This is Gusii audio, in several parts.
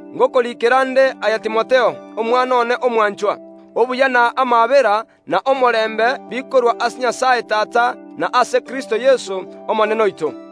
gocha ase Timotheo, omwana one omwanchwa: Obuya na amaabera, na omorembe, bikorwa ase Nyasae Tata, na ase Kristo Yeso, Omonene oito.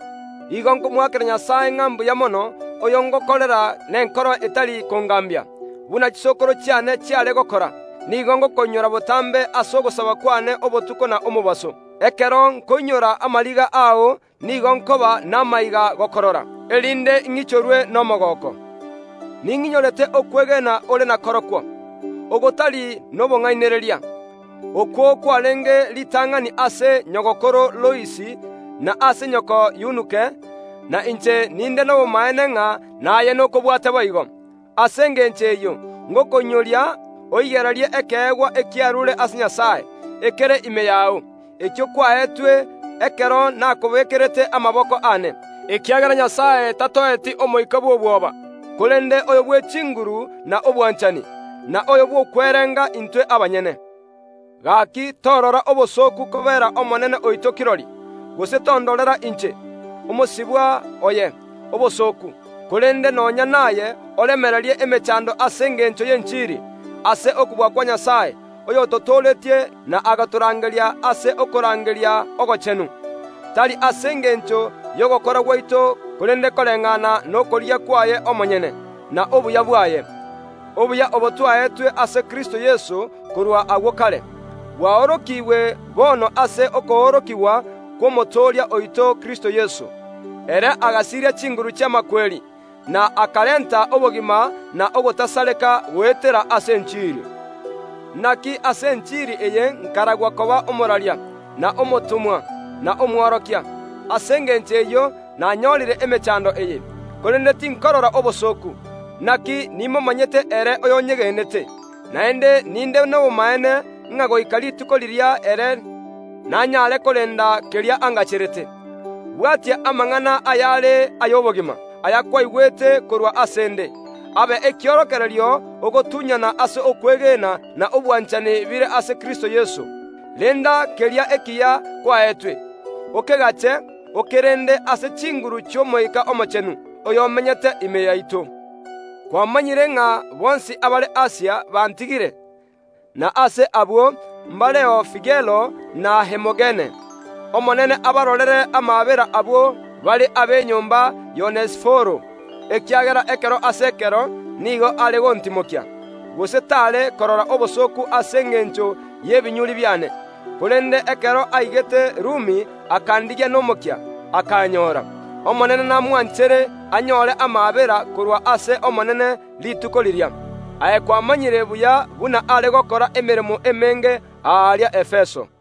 Nigo nkomoakera Nyasae ng’a mbuya mono, oyo ngokorera nenkoro etari kongaambia, buna chisokoro chiane chiare gokora, nigo ngokoinyora botambe ase ogosaba kw’ane obotuko na omobaso. Ekero nkoinyora amariga ao nigo nkoba namaiga gokorora, erinde ing’ichorwe nomogooko. Ning’inyorete okwegena ore nakorokwo, gotari nobong’ainereria, okwo kwareenge ritang’ani ase nyagokoro Lois na ase nyoko Yunuke, na inche ninde nobomaene ng’a naye nokobwate boigo. Ase engencho eyio ngokoinyoria, oigererie ekeegwa ekiaruure ase Nyasae, ekere ime yao, ekio kwaetwe ekero nakobeekerete amaboko aane, ekiagera omoika twaetwe na Nyasae tari oyo bw’obwoba, korende oyo bw’echinguru na obwanchani, na omoika bw’okwerenga intwe abanyene. Gaaki, torora obosooku kobeera Omonene oito kirori, gose tondorera inche, omosibwa oye, obosooku, korende nonya naye oremererie emechando ase engencho y’enchiri, ase okobua kwa Nyasae, oyototooretie na agatorangeria ase okorangeria ogochenu, tari ase engencho y’ogokora gwaito korende koreng’ana nokorigia kwaye omonyene, na obuya bwaye. Obuya obo twaetwe ase Kristo Yeso korwa agwo kare bwaorokigwe bono ase okoorokigwa kw’Omotooria oito Kristo Yeso. Ere agasiria chinguru chi’amakweri, na akarenta obogima na ogotasareka goetera ase enchiri. Inaki ase enchiri eye nkaragwa koba omoraria, na omotomwa, na omworokia. Ase engencho eyio nanyoorire emechando eye. Korende tinkorora obosooku, inaki nimomanyete ere oyonyegenete, naende ninde nobomaene ng’a goika Rituko riria ere nanyare korenda keria angacherete. Bwatia amang’ana ayare ay’obogima, ayakwaigwete korwa ase ’nde, abe ekiorokererio ogotunyana ase okwegena na obwanchani bire ase Kristo Yeso. Renda keria ekiya kwaetwe, okegache, okerende ase chinguru chi’Omoika Omochenu, oyomenyete ime yaito. Kwamanyire ng’a bonsi abare Asia bantigire, na ase abwo mbareo Figelo na Hermogene. Omonene abarorere amaabera abwo bare ab’enyomba y’Onesiforo, ekiagera ekero ase ekero nigo are gontimokia, gose t’are korora obosooku ase engencho y’obosibwa bwane. Korende ekero aigete Rumi akandigia nomokia, akanyoora. Omonene namwanchere anyoore amaabera korwa ase Omonene Rituko riria. Aye kwamanyire buya buna are gokora emeremo emenge aria Efeso.